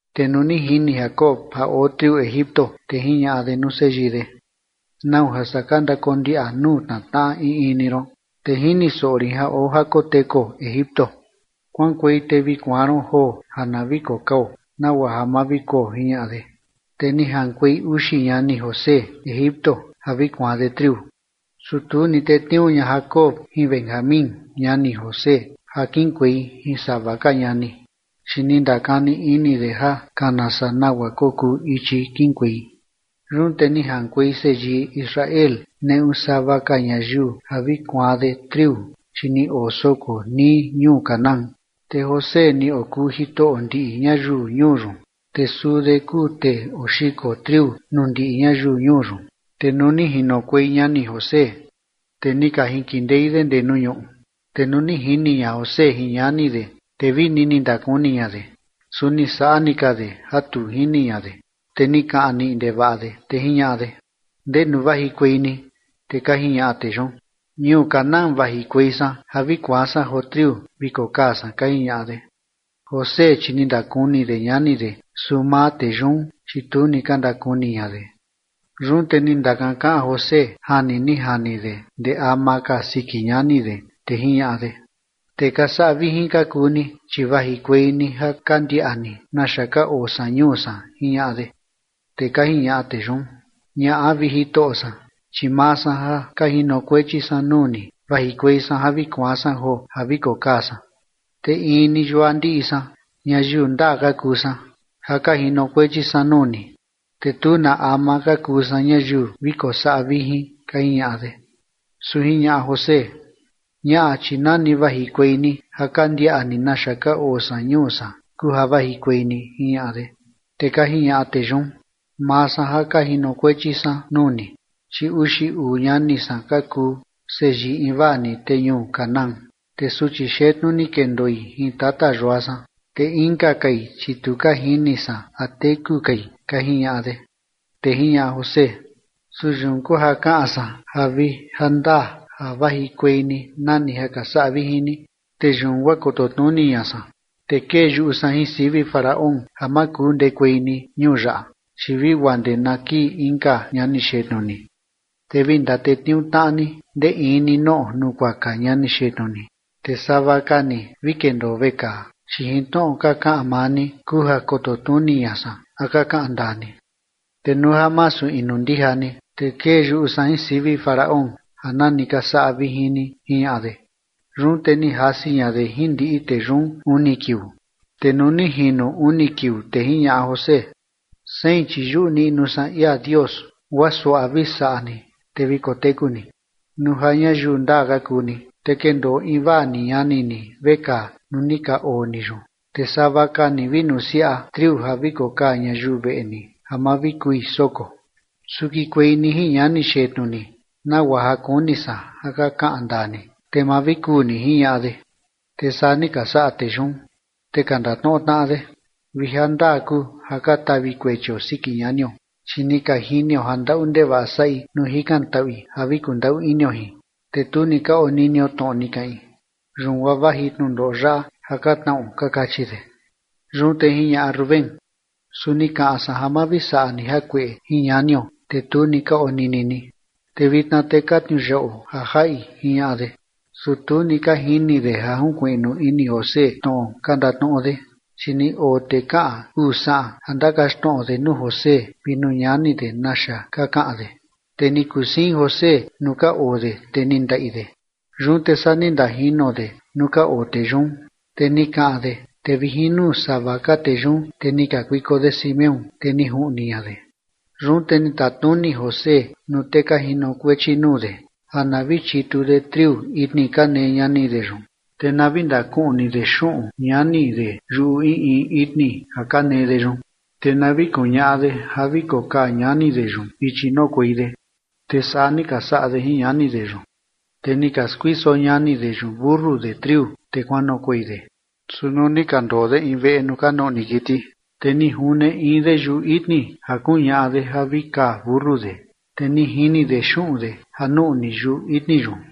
Te nuu ni jini Jacob ja oo triu Egipto, te jiñaꞌa de nuu seyii de: ―¿Nau ja saa ka ndakondiaꞌa nuu tnatnaꞌa in in ni ron? Te jini soꞌo rin ja oo ja kotekuo Egipto. Kuaꞌankuei te vi kuaan ron joo ja na vi kokao nagua ja ma vi kuo ―jiñaꞌa de. Te ni jaꞌankuei uxi ñani José Egipto ja vi kuaan de triu. Su tu ni tetniuu ña Jacob jin Benjamín ñani José ja kiꞌinkuei jin sava ka ñani, chi ni ndakani ini de ja kana saa nagua kokuu ichi kiꞌinkuei. Yun te ni jaꞌankuei seyii Israel neꞌu sava ka ñayiu ja vi kuaan de triu, chi ni oo soko nii ñuu Canaán. Te José ni okuu jitoꞌo ndiꞌi ñayiu ñuu yun, te suu de kuu tee oxiko triu nuu ndiꞌi ñayiu ñuu yun. Te nuu ni jinokuei ñani José, te ni ka jinkindei de ndee nuu ñuꞌu. Te nuu ni jini ña José jin ñani de, te vini ni ndakuni ña de, su ni saꞌa ni ka de ja tu jini ña de, te ni kaꞌan niꞌi ndevaꞌa de, te jiñaꞌa de: ―¿Ndenu vajikuei ni? Te ka jiñaꞌa tee yun: ―Ñuu Canaán vajikuei san ja vi kuaan san joo triu vi kokaa san ―ka jiñaꞌa de. José, chi ni ndakuni de ñani de, su maa tee yun, chi tu ni ka ndakuni ña de. Yun te ni ndakankaꞌan José jani ni jani de ndee ama ka siki ñani de, te jiñaꞌa de: ―Tee ka saꞌa vijin ka kuu ni, chi vajikuei ni ja ka ndiaꞌa ni naxa ka oo san ñuu san ―jiñaꞌa de. Te ka jiñaꞌa tee yun: ―Ñaꞌa, vi jitoꞌo san, chi maa san ja ka jinokuechi san nuu ni, vajikuei san ja vi kuaan san joo ja vi kokaa san. Te in ni yua ndiꞌi san, ñayiu ndaa ka kuu san ja ka jinokuechi san nuu ni, te tu na ama ka kuu san ñayiu vi kosaꞌa vijin ―ka jiñaꞌa de. Su jiñaꞌa José: ―Ñaꞌa, chi nani vajikuei ni ja ka ndiaꞌa ni naxa ka oo san ñuu san kuu ja vajikuei ni ―jiñaꞌa de. Te ka jiñaꞌa tee yun: ―Maa san ja ka jinokuechi san nuu ni, chi uxi uu ñani san ka kuu seyii invaa ni tee ñuu Canaán. Te suchi xetnu ni kendoi jin tata yua san, te inka kai, chi tu ka jini san a teku kai ―ka jiñaꞌa de. Te jiñaꞌa José: ―Su yun kuu ja kaꞌan san ja vi jandaa ja vajikuei ni nani ka saꞌa vijin ni. Te yun guaa koto tnuni ña san. Te kee yuꞌu san jin sivi Faraón ja ma kuu ndekuei ni ñuu yaꞌa, chi vi guaa ndee na kii inka ñani xetnu ni. Te vi ndatetniuu tnaꞌa ni ndee in ni noꞌo nukuaka ñani xetnu ni, te sava ka ni vi kendoo vekaa, chi jin tnoꞌo ka kaꞌan maa ni kuu ja koto tnuni ña san a ka kaꞌan ndaa ni. Te nuu ja masu inu ndija ni, te kee yuꞌu san jin sivi Faraón ja nani ka saꞌa vijin ni ―jiñaꞌa de. Yun te ni jasi ña de jin ndiꞌi tee yun uni kiuu. Te nuu ni jino uni kiuu, te jiñaꞌa José: ―Sein, chi yuꞌu niꞌnu san ia Dios guaa suaꞌa vi saꞌa ni, te vi koteku ni. Nuu ja ñayiu ndaa ka kuu ni, te kendoo invaa ni ñani ni vekaa nuu ni ka oo ni yun, te sava ka ni vi nusiaꞌa triu ja vi kokaa ñayiu veꞌe ni ja ma vi kui soko. Su kikuei ni jin ñani xetnu ni nagua ja kuni san ja ka kaꞌan ndaa ni, te ma vi kuu ni ―jiñaꞌa de. Te saa ni ka saꞌa tee yun. Te ka ndatnoꞌo tnaꞌa de: ―Vi ja ndaa kuu ja ka tavi kuechio siki ñanio, chi ni ka jinio ja ndaꞌu ndevaꞌa saꞌi nuu jikantaꞌui ja vi kundaꞌu inio jin, te tu ni ka oninio tnoꞌo ni kaꞌin. Yun guaa vaji tnundoꞌo yaꞌa ja ka tnaꞌo ―ka kachi de. Yun te jiñaꞌa Rubén: ―Su ni kaꞌan san ja ma vi saꞌa ni jakueꞌe jin ñanio, te tu ni ka onini ni, te vitna te ka tniuyaꞌuo ja jaꞌi ―jiñaꞌa de. Su tu ni ka jini de ja junkuiꞌnu ini José tnoꞌo ka ndatnoꞌo de, chi ni oo tee kaꞌan uu saꞌan ja ndakaxtnoꞌo de nuu José vi nuu ñani de naxa ka kaꞌan de. Te ni kusiin José nuu ka oo de, te ni ndaꞌi de. Yun te saa ni ndajino de nuu ka oo tee yun, te ni kaꞌan de, te vi jin nuu sava ka tee yun, te ni kakuiko de Simeón, te ni juꞌni ña de. Yun te ni tatnuni José nuu tee ka jinokuechi nuu de ja na vi chitu de triu itni ka nee ñani de yun, te na vi ndakuꞌni de xuꞌun ñani de yuꞌu in in itni ja ka nee de yun, te na vi kuñaꞌa de ja vi kokaa ñani de yun ichi noꞌokuei de, te saa ni ka saꞌa de jin ñani de yun. Te ni ka skuiso ñani de yun mentu de triu, te kuanoꞌokuei de. Su nuu ni ka ndoo de in veꞌe nuu ka nuꞌni kiti, te ni june in de yuꞌu itni ja kuñaꞌa de ja vi kaa mentu de, te ni jini de xuꞌun de ja nuꞌni yuꞌu itni yun.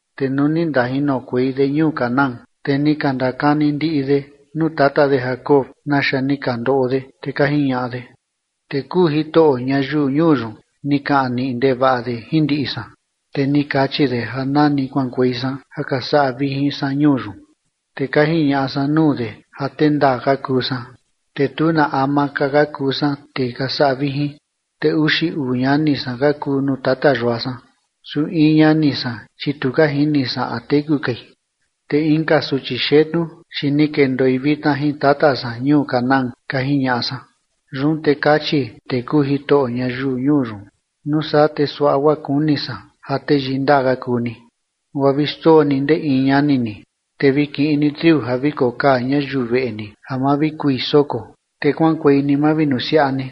Te nuu ni ndajinokuei de ñuu Canaán, te ni ka ndakani ndiꞌi de nuu tata de Jacob naxa ni ka ndoꞌo de, te ka jiñaꞌa de: ―Tee kuu jitoꞌo ñayiu ñuu yun, ni kaꞌan niꞌi ndevaꞌa de jin ndiꞌi san, te ni kachi de ja nani kuaꞌankuei san ja ka saꞌa vijin san ñuu yun. Te ka jiñaꞌa san nuu de ja tee ndaa ka kuu san, te tu na ama ka ka kuu san tee ka saꞌa vijin. Te uxi uu ñani san ka kuu nuu tata yua san, su in ñani san, chi tu ka jini san a teku kai, te inka suchi xetnu, chi ni kendoi vitna jin tata san ñuu Canaán, ka jiñaꞌa san. Yun te kachi tee kuu jitoꞌo ñayiu ñuu yun: “Nuu saa te suaꞌa guaa kuni san ja teyii ndaa ka kuu ni, guaa vi xndoo ni ndee in ñani ni, te vi kiꞌin ni triu ja vi kokaa ñayiu veꞌe ni ja ma vi kui soko, te kuaꞌankuei ni mavinusiaꞌa ni.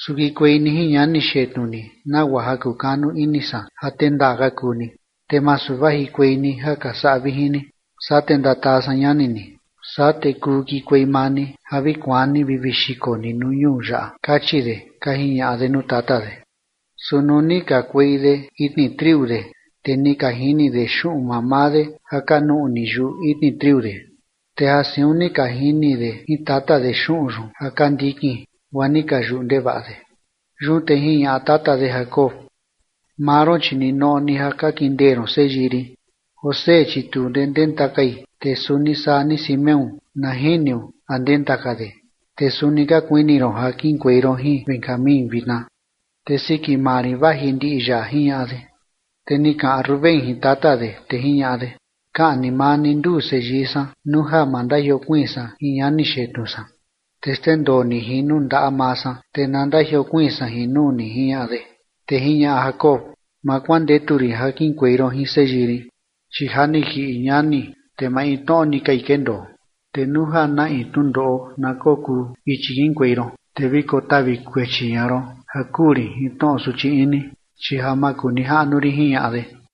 Su kikuei ni jin ñani xetnu ni, nagua ja kukanu ini san ja tee ndaa ka kuu ni, te masu vajikuei ni ja ka saꞌa vijin ni, saa te ndataa san ñani ni. Saa te kuu kikuei maa ni ja vi kuaan ni vi vi xiko ni nuu ñuu yaꞌa”, kachi de ―ka jiñaꞌa de nuu tata de. Su nuu ni kakuei de itni triu de, te ni ka jini de xuꞌun mamaa de ja ka nuꞌni yuꞌu itni triu de, te ja siun ni ka jini de jin tata de xuꞌun yun ja ka ndikin, guaa ni ka yuꞌu ndevaꞌa de. Yun te jiñaꞌa tata de Jacob: ―Maa ron chi ninoꞌo ni ja ka kindee ron seyii rin. José, chi tu ndee ndenta kai, te suni saa ni Simeón na jiniu a ndenta ka de, te suni ka kuini ron ja kiꞌinkuei ron jin Benjamín vitna, te siki maa rin vaji ndiꞌi yaꞌa ―jiñaꞌa de. Te ni kaꞌan Rubén jin tata de, te jiñaꞌa de: ―Kaꞌni maa ni nduu seyii san nuu ja ma ndajiokuiin san jin ñani xetnu san. Te xndendoo ni jin nuu ndaꞌa maa san, te na ndajiokuiin san jin nuu ni ―jiñaꞌa de. Te jiñaꞌa Jacob: ―Ma kuandetu rin ja kiꞌinkuei ron jin seyii rin, chi ja ni jiꞌi ñani, te maintnoꞌo ni kai kendoo, te nuu ja na in tnundoꞌo na kokuu ichi kiꞌinkuei ron, te vi kotavi kuechi ña ron ja kuu rin jin tnoꞌo suchi ini, chi ja makunijaꞌnu rin ―jiñaꞌa de.